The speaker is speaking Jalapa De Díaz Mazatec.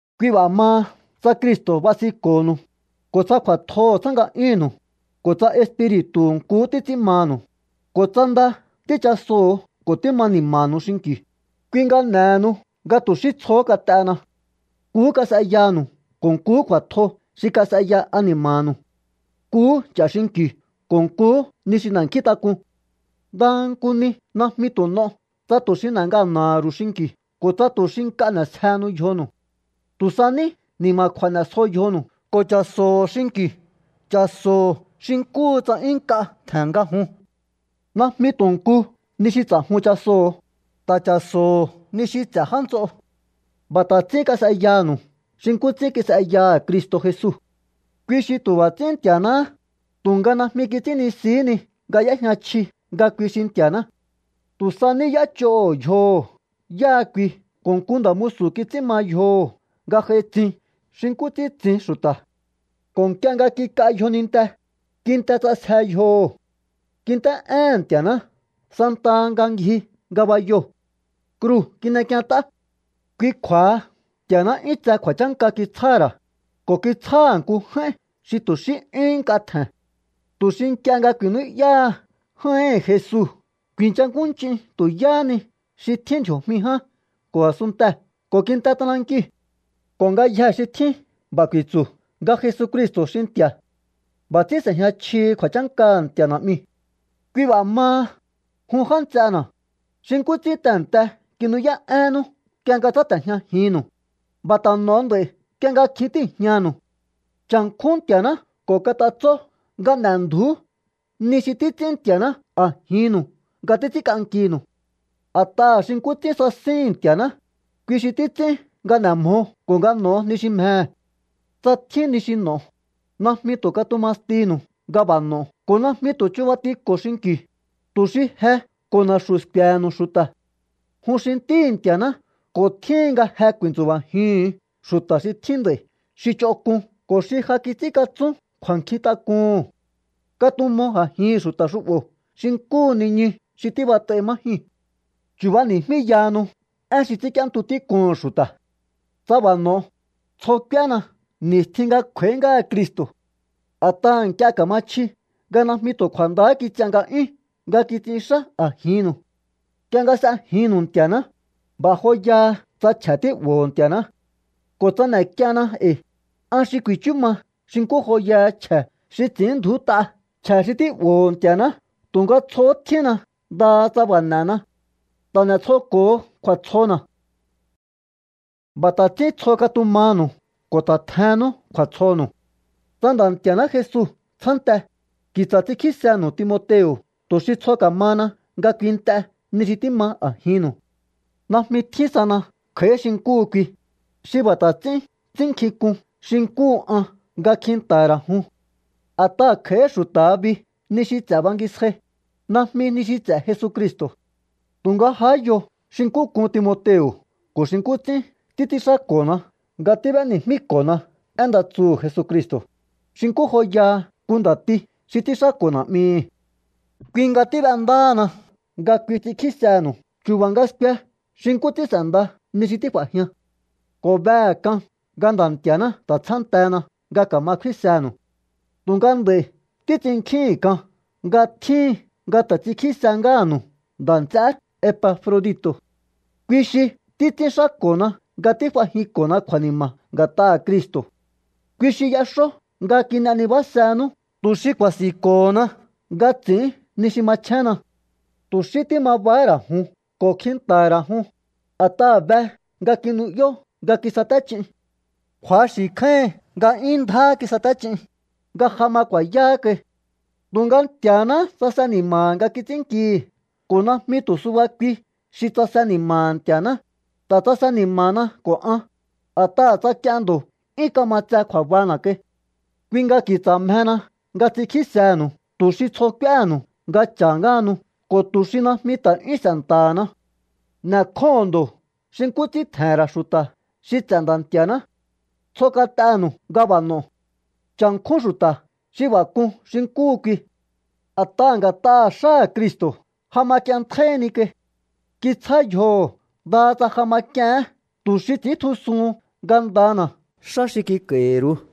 Kui b'a̱ maha tsa Cristo̱ basinko̱nu̱u, ko̱ tsa kju̱a̱tjoho̱ tsjá nga'yúnnu̱u, ko̱ tsa Espiri̱tu̱hu̱ nkuhú títs'ín manu̱u, ko̱ tsa nda tíchasoho̱o ko̱ tíma ni̱ma̱nu̱u xinki̱u, kui nga n'e̱henu nga tu̱ xí tsjohó kat'ena. Nkuhú kas'eyanu̱u ko̱ nkuhú kju̱a̱tjo xi kas'eya ani̱ma̱nu̱u. Nkuhú ch'a̱ xinki̱u ko̱ nkuhú ni xi n'e̱nkjíntak'un. Ndaha nku ni najmi tu̱ n'o tsa tu̱ xi n'e̱ ngana̱ha̱ ru̱u xinki̱u ko̱ tsa tu̱ xi nk'a n'e̱sjehenu yjonu̱u. Tu̱ sa ní ni̱ma̱kju̱a̱ n'e̱sjo yjonu̱u ko̱ cha̱so̱ho̱ xinki̱u, cha̱so̱ho̱ xi nkúhu tsa 'yún nk'a tje̱n nga jun. Najmi tu̱ nku ni xi ts'a̱jun chasoho̱, ta̱ cha̱so̱ho̱ ni xi ts'e̱ já nts'o. B'a̱ ta̱ ts'ín kas'eyanu̱u xi nkú ts'ín kis'eyaha̱ Cristo̱ Jesu. Kui xi tu̱ b'a̱ ts'ín Nti̱a̱náhá, tu̱nga najmi kits'ínnisihí ni nga y'éjña chji nga kui xi Nti̱a̱ná. Tu̱ sa ní y'éch'oho̱ yjoho̱ yáha kui ko̱ nku nda̱ musu̱ kits'ín ma yjoho̱ nga j'ai tsin xi nkú ts'ín tsin xu̱ta̱. Ko̱ nk'ie nga kik'a yjoninte, kinte ts'asje yjoho̱. Kint'é'éhe̱n Nti̱a̱ná santaha nga ngji ngabayoo̱. Kruu̱ kin'ek'ient'á. Kui kju̱a̱ha Nti̱a̱ná 'yún tse kju̱a̱chánka kitsjáha̱ ra̱, ko̱ kitsjáha̱ nku j'áín xi tu̱ xí 'yúhún nk'a tje̱n, tu̱ xi nk'ie nga ku̱i̱nú'yáha j'áíhi̱n Jesu ku̱i̱nchakúnch'in tu̱ yáhá ni xi tjín ndji̱o̱jmi ján ko̱ a̱sunntee̱ ko̱ kinte t'anankiu̱. Ko̱ ngayjee̱ xi tjín b'a̱ ku̱i̱tsu̱ nga Jesucristo̱ xi Nti̱a̱. B'a̱ ts'ín s'e̱jña chjihi kju̱a̱chánkaha̱ Nti̱a̱ Na'miu̱. Kui b'a̱ maha, jun já nts'ena̱, xi nkú ts'ín tehe̱nte kinu'yá'énnú nk'ie nga tsáte̱jñajinnu̱u, b'a̱ ta̱ n'o̱o nd'a̱i̱ nk'ie nga kjin tíi̱jñanu̱u. Cha̱nkjún Nti̱a̱ná ko̱ kat'atsó nga n'e̱ndju̱ú ni xi títs'ín Nti̱a̱ná a̱jinnu̱u nga títs'ínk'ankinu̱u. A̱t'aha̱ xi nkú ts'ín sasíhi̱n Nti̱a̱ná, kui xi títs'ín nga n'e̱ mjo ko̱ nga n'o̱o ni xi mjehe̱. Tsa tjín ni xi n'o̱o, najmi tu̱ katuma stinu̱u nga b'a̱ n'o ko̱ najmi tu̱ chubatiko̱o xinki̱u, tu̱ xi je ko̱ na̱xu̱ sku̱e̱he̱nu̱u xu̱ta̱. Jun xi ntíhi̱ Nti̱a̱ná ko̱ tjíhin nga je ku̱i̱ntsu̱ba̱jiuhu̱n xu̱ta̱ xi tjín nd'a̱i̱ xi ch'onk'un ko̱ xi ja kits'ínkatsún kju̱a̱nkjintak'uhu̱n. Katumo a̱jihi̱n xu̱ta̱ xu'bo̱ xi nkúhu niñu xi tíbat'ai má jyuu̱n. Chu̱bani̱jmíyahanu én xi ts'ínk'íéntu tík'uhu̱n xu̱ta̱. Tsa b'a̱ n'o̱o, tsjo k'úéna ni̱stjin nga kj'u̱a̱í ngáha Cristo̱. A̱t'aha̱ nk'ie ka̱ma chji nga najmi tu̱ kju̱a̱ndahá kits'ian nga'yún nga kits'inxá a̱jinnu̱u. Nk'ie nga s'ejinnu̱u Nti̱a̱ná, b'a̱ joyaha tsa chje̱ tí'bo̱ho̱o Nti̱a̱ná. Ko̱ tsa n'e̱k'ienna e̱i̱, an xi ku̱i̱chú ma xi nkú joyaha chje̱ xi ts'i̱ínndju̱út'a chje̱ xi tí'bo̱ho̱ Nti̱a̱ná. Tu̱nga tsjohó tjínna ndaha tsa b'a̱ n'e̱na. Ta̱ n'e̱tsjoko̱ho kju̱a̱tsjona̱. B'a̱ ta̱ ts'ín tsjo katumanu̱u ko̱ ta̱ tjennú kju̱a̱tsjonu̱u. Tsa Nda̱ Nti̱a̱ná Jesu tsjánte, ki̱tsa̱ ts'inkjísenu̱u Timoteo̱ tu̱ xi tsjo ka̱mahana nga kuint'e ni xi tíma a̱jinnu̱u. Najmi tjín sana kj'a̱í xi nkúhu kui, xi b'a̱ ta̱ ts'ín ts'ínnkjink'un xi nkúhu an nga kjinta̱ha̱ ra̱ jun. A̱t'aha̱ kj'a̱í xu̱ta̱ha bi ni xi ts'e̱ bangisjai, najmi ni xi ts'e̱ Jesucristo̱. Tu̱nga jahá yo xi nkú k'un Timoteo̱ ko̱ xi nkú ts'ín títs'ínxáko̱na nga tíb'éni̱jmíko̱na én nda tsuhu̱ Jesucristo̱, xi nkú joyaha nku nda̱ti xi ts'ínxáko̱ na̱'mihi̱. Kui nga tíb'endáhana nga kui ts'inkjísenu̱u chu̱ba̱ nga skue xi nkú ts'ín s'e̱nda ni xi tíf'a̱jian. Ko̱ behe̱ k'an nga Nda̱ Nti̱a̱ná ta̱ tsjántena nga ka̱ma kfínsenu̱u. Tu̱nga nd'a̱i̱ títs'innkjíhi̱n k'an nga tjíhin nga ta̱ ts'inkjísehé ngáha̱nu̱u nda̱ nts'eé Epafrodito̱. Kui xi títs'ínxáko̱na nga tíf'ajinko̱na kju̱a̱ni̱ma̱ nga̱t'aha̱ Cristo̱. Kui xi y'exó nga kin'e nibásenú tu̱ xi ku̱a̱si̱nko̱hona nga ts'i̱ín ni xi machjénna. Tu̱ xí tíma bahá ra̱ jun ko̱ kjinta̱ha̱ ra̱ jun, a̱t'aha̱ be nga kinu'yó nga kisaté ch'in. Kju̱axi̱ kjáíhin nga 'yún ndjáhá kisaté ch'in, nga ja ma ku̱a̱yáhá kai. Tu̱nga Nti̱a̱náhá tsase ni̱ma̱ha̱ nga kits'ínnkihi̱. Ko̱ najmi tu̱ suba kui xi tsase ni̱ma̱ha̱ Nti̱a̱ná, ta̱ tsase ni̱ma̱na ko̱ an, a̱t'aha̱ tsa k'ien ndo̱ 'yún kama tse kju̱a̱bana̱ kai. Kui nga ki̱tsa̱ mjehena nga ts'inkjísehe̱nu̱u tu̱ xi tsjo k'úéhe̱nu̱u nga cha̱ ngáhanu ko̱ tu̱ xi najmi ta̱ 'yún s'e̱nta̱hana. N'e̱kjóho̱on ndo̱ xi nkú ts'ín tje̱he̱n ra̱ xu̱ta̱ xi ts'e̱ Nda̱ Nti̱a̱ná. Tsjo kat'enu̱u nga b'a̱ n'o̱o. Cha̱nkjún xu̱ta̱ xi b'a̱ k'un xi nkúhu kui. A̱t'aha̱ nga̱t'aha̱ xáha̱ Cristo̱ ja ma k'ienntjáíhí ni kai. Kitsjá yjoho̱ ndaha tsa ja ma k'iehén tu̱ xi ts'i̱íntjusuhun ngandana̱ xá xi kik'a̱i̱hi̱ru̱u.